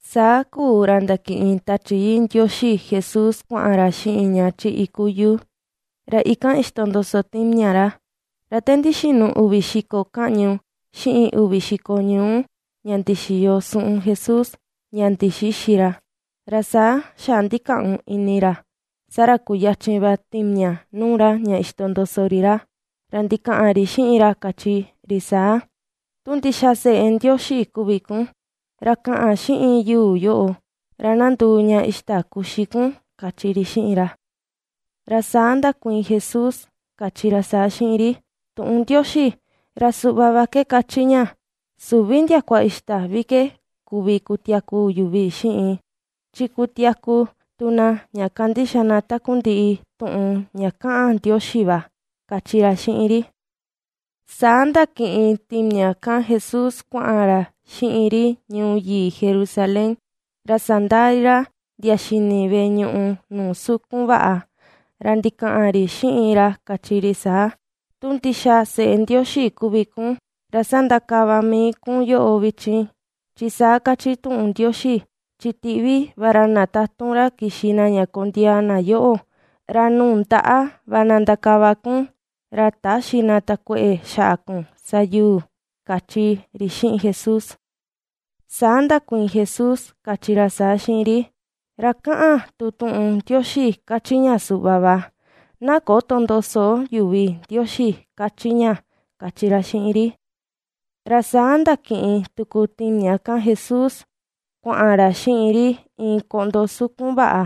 Saa kuu ra ndakiꞌin Tachi Yii Ndioxi Jesús kuaꞌan ra xiꞌin ña chi iku yuu, ra ikan ixtondoso timiaꞌa ra. Ra te ndixinu uvi xiko kaꞌñu, xiꞌin uvi xiko ñuu ña ndixiyo suꞌun Jesús, ña ndixïxi ra, ra saa xaꞌa ndikaꞌun ini ra. Saa ra kuyachin va timiaꞌa nuu ra ña ixtondoso ri ra, ra ndikaꞌan ri xiꞌin ra kachi ri saa: ―Tu ndixa seꞌe Ndioxi kuvi kun, ra kaꞌan xiꞌin yuu yoꞌo ra na nduu ña ixta kuxi kun ―kachi ri xiꞌin ra. Ra saa ndakuiin Jesús kachi ra saa xiꞌin ri: ―Tuꞌun Ndioxi ra suꞌva va ke kachi ña: “Süvi ndiakua ixta vi ke kuvi kutiaku yuvi xiꞌin, chi kutiaku tu na ña kandixa na takundiꞌi tuꞌun ña kaꞌan Ndioxi va” ―kachi ra xiꞌin ri. Saa ndakiꞌin timiaꞌa kan Jesús kuaꞌan ra xiꞌin ri ñuu yii Jerusalén, ra sandaa ri ra ndia xini veꞌe ñuꞌu nuu sukun vaꞌa. Ra ndikaꞌan ri xiꞌin ra kachi ri saa: ―Tu ndixa seꞌe Ndioxi kuvi kun ra sandakava mii kun yoꞌo vichin, chi saa kachi tuꞌun Ndioxi: Chi tiꞌvi va ra na tatun ra kixi na ña kondiaa na yoꞌo, ra nuu ndaꞌa va ná ndakava kun, ra täxi na takueꞌe xaꞌa kun sa yuu ―kachi ri xiꞌin Jesús. Saa ndakuiin Jesús kachi ra saa xiꞌin ri: ―Ra kaꞌan tu tuꞌun Ndioxi kachi ña suꞌva va: “Na köto ndoso yuvi Ndioxi” ―kachi ña, kachi ra xiꞌin ri. Ra saa ndakiꞌin tuku timiaꞌa kan Jesús kuaꞌan ra xiꞌin ri iin koꞌndo sukun vaꞌa,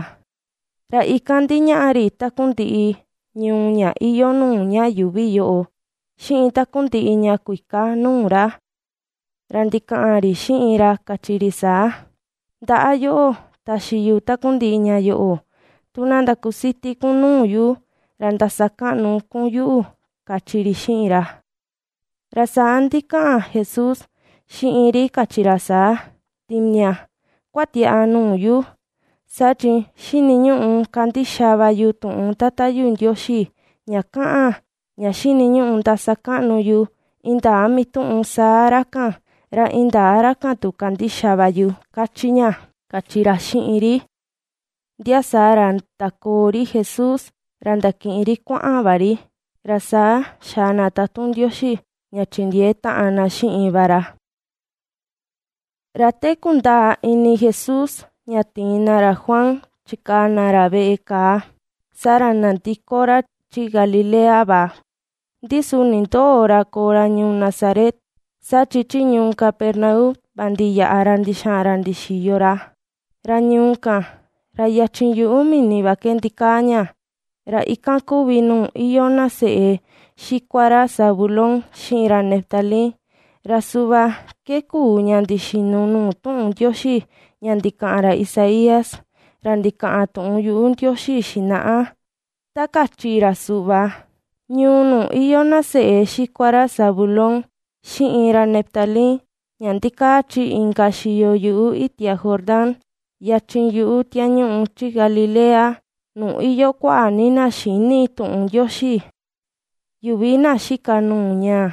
ra ikan ndiñaꞌa ri takundiꞌi ñuu ña iyoo nuu ña yuuvi yoꞌo, xiꞌin takundiꞌi ña kuika nuu ra. Ra ndikaꞌan ri xiꞌin ra kachi ri saa: ―Ndaꞌa yoꞌo taxi yu takundiꞌi ña yoꞌo, tu na ndakusiti kun nuu yu, ra ndasakaꞌnu kun yuꞌu ―kachi ri xiꞌin ra. Ra saa ndikaꞌan Jesús xiꞌin ri kachi ra saa: ―Timiaꞌa, kuatiaꞌa nuu yu, saa chi xiniñuꞌu kandixa va yu tuꞌun Tata yu Ndioxi ña kaꞌan ña xiniñuꞌu ndasakaꞌnu yu indaa mituꞌun saa ra kan, ra indaa ra kan tu kandixa va yu, ^kachi ña ―kachi ra xiꞌin ri. Ndia saa ra ndakoo ri Jesús ra ndakiꞌin ri kuaꞌan va ri, ra saa xaa na tatun Ndioxi ña chindiee taꞌan na xiꞌin va ra. Ra te kundaa ini Jesús ña tiin na ra Juan chikaa na veꞌe kàà, saa ra nandiko ra chi Galilea va. Ndi su nindöo ra koo ra ñuu Nazaret, saa chi chi ñuu Capernaum va ndiyaꞌa ra ndixaꞌan ra ndixiyo ra. Ra ñuu kan, ra yachin yuꞌu mini va ke ndikaa ña, ra ikan kuvi nuu iyoo na seꞌe xikua ra Zabulón, xiꞌin ra Neftalí. Ra suꞌva ke kuu ña ndixinu nuu tuꞌun Ndioxi ña ndikaꞌan ra Isaías, ra ndikaꞌan tuꞌun yuꞌu Ndioxi xinaꞌa, ta kachi ra suꞌva: Ñuu nuu iyoo na seꞌe xikua ra Zabulón xiꞌin ra Neftalí, ña ndikaa chi inka xiyo yuꞌu itia Jordán, yachin yuꞌu tiañuꞌu chi Galilea, nuu iyoo kuaꞌa ni na xïni tuꞌun Ndioxi. Yuvi na xika nuu ñaa,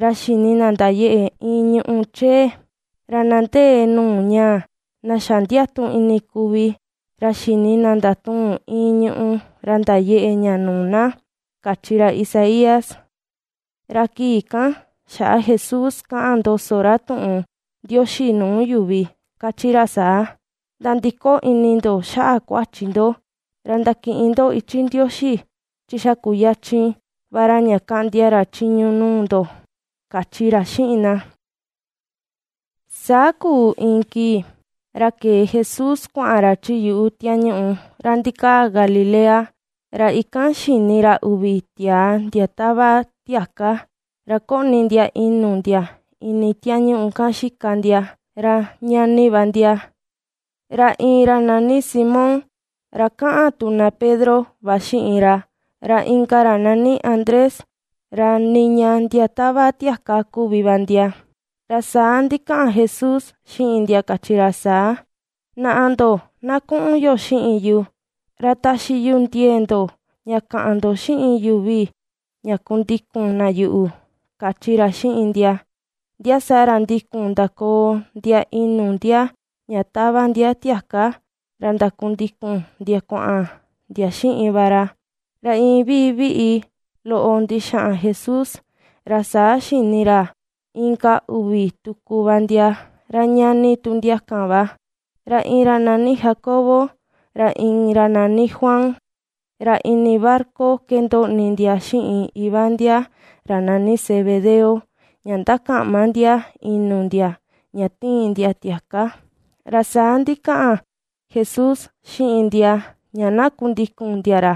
ra xini na ndayeꞌe iin ñùꞌù chee; ra na ndee nuu ñaa, na xa ndiatu ini kuvi, ra xini na ndatuun iin ñùꞌù ra ndayeꞌe ña nuu na, kachi ra Isaías. Ra kii kan xaꞌa Jesús kaꞌan ndoso ra tuꞌun Ndioxi nuu yuvi, kachi ra saa: ―Nandiko ini ndo xaꞌa kuachi ndo ra ndakiꞌin ndo ichi Ndioxi, chi xa kuyachin va ra ña kaꞌndia ra chiñu nuu ndo ―kachi ra xiꞌin na. Saa kuu iin kii, ra kee Jesús kuaꞌan ra chi yuꞌu tiañuꞌu ra ndikaa Galilea, ra ikan xini ra uvi tiaa ndia tava tiaka ra koꞌni ndia inu ndia ini tiañuꞌu kan xika ndia; ra ñani va ndia, ra iin ra nani Simón ra kaꞌan tu na Pedro va xiꞌin ra, ra inka ra nani Andrés, ra niña ndia tava tiaka kuvi va ndia. Ra saa ndikaꞌan Jesús xiꞌin ndia kachi ra saa: ―Naꞌa ndo na kuꞌun yo xiꞌin yu, ra sañaꞌa yu ndoꞌo ndia kuꞌva ke ndatuꞌun ndo xiꞌin yuvi ra ndakundikun na yuꞌu ―kachi ra xiꞌin ndia. Ndia saa ra ndikun ndakoo ndia inu ndia ña tava ndia tiaka ra ndakundikun ndia kuaꞌan ndia xiꞌin va ra. Ra iin viviꞌi loꞌo ndixaꞌan Jesús, ra saa xini ra inka uvi tuku va ndia, ra ñani tu ndia kan va; ra iin ra nani Jacobo ra inka ra nani Juan, ra ini barca ke ndoꞌni ndia xiꞌin iva ndia ra nani Zebedeo ña ndakaꞌma ndia inu ndia ña tiin ndia tiaka. Ra saa ndikaꞌan Jesús xiꞌin ndia, ña ná kundikun ndia ra.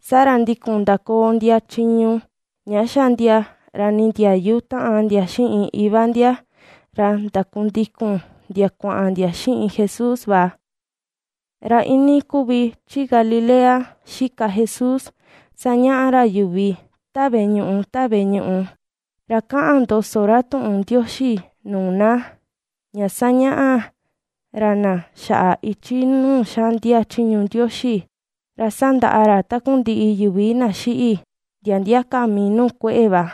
Saa ra ndikun ndakoo ndia chiñu ña xa ndia ra nindiayu taꞌan ndia xiꞌin Iva ndia, ra ndakundikun ndia kuaꞌan ndia xiꞌin Jesús va. Ra iinii kuvi chi Galilea ^xika Jesús sañaꞌa ra yuvi ta veꞌe ñuꞌu ta veꞌe ñuꞌu, ra ^kaꞌan ndoso ra tuꞌun Ndioxi nuu na, ña ^sañaꞌa ra na xaꞌa ichi nuu xaꞌndia chiñu Ndioxi, ra sandaꞌa ra takundiꞌi yuvi na xiꞌi, ndia ndia ka mii nuu kueꞌe va.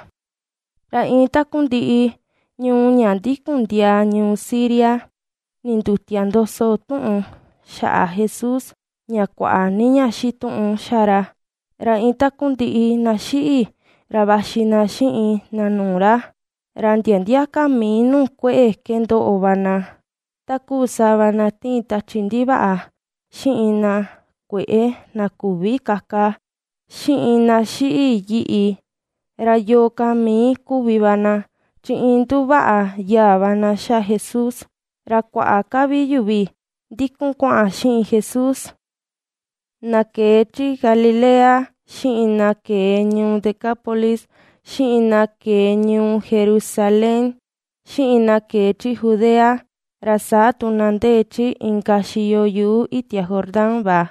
Ra iin takundiꞌi ñuu ña ndikun ndiaa ñuu Siria, ndindutia ndoso tuꞌun xaꞌa Jesús, ña kuaꞌa ni ña xituꞌun xa ra, ra iin takundiꞌi na xiꞌi, ra vaxi na xiꞌin na nuu ra. Ra ndia ndia ka mii nuu kueꞌe ke ndoꞌo va na, takuu sava na tiin tachi ndivaꞌa, xiꞌin na kueꞌe na küvi kaka, xiꞌin na xiꞌi yiꞌi, ra yo̱o̱ ka mii kuvi va na, chi iin nduvaꞌa yaa va na xa Jesús. Ra kuaꞌa ka vi yuvi ndikun kuaꞌan xiꞌin Jesús, na kee chi Galilea, xiꞌin na kee ñuu Decápolis, xiꞌin na kee ñuu Jerusalén, xiꞌin na kee chi Judea, ra saa tu na ndee chi inka xiyo yuꞌu itia Jordán va.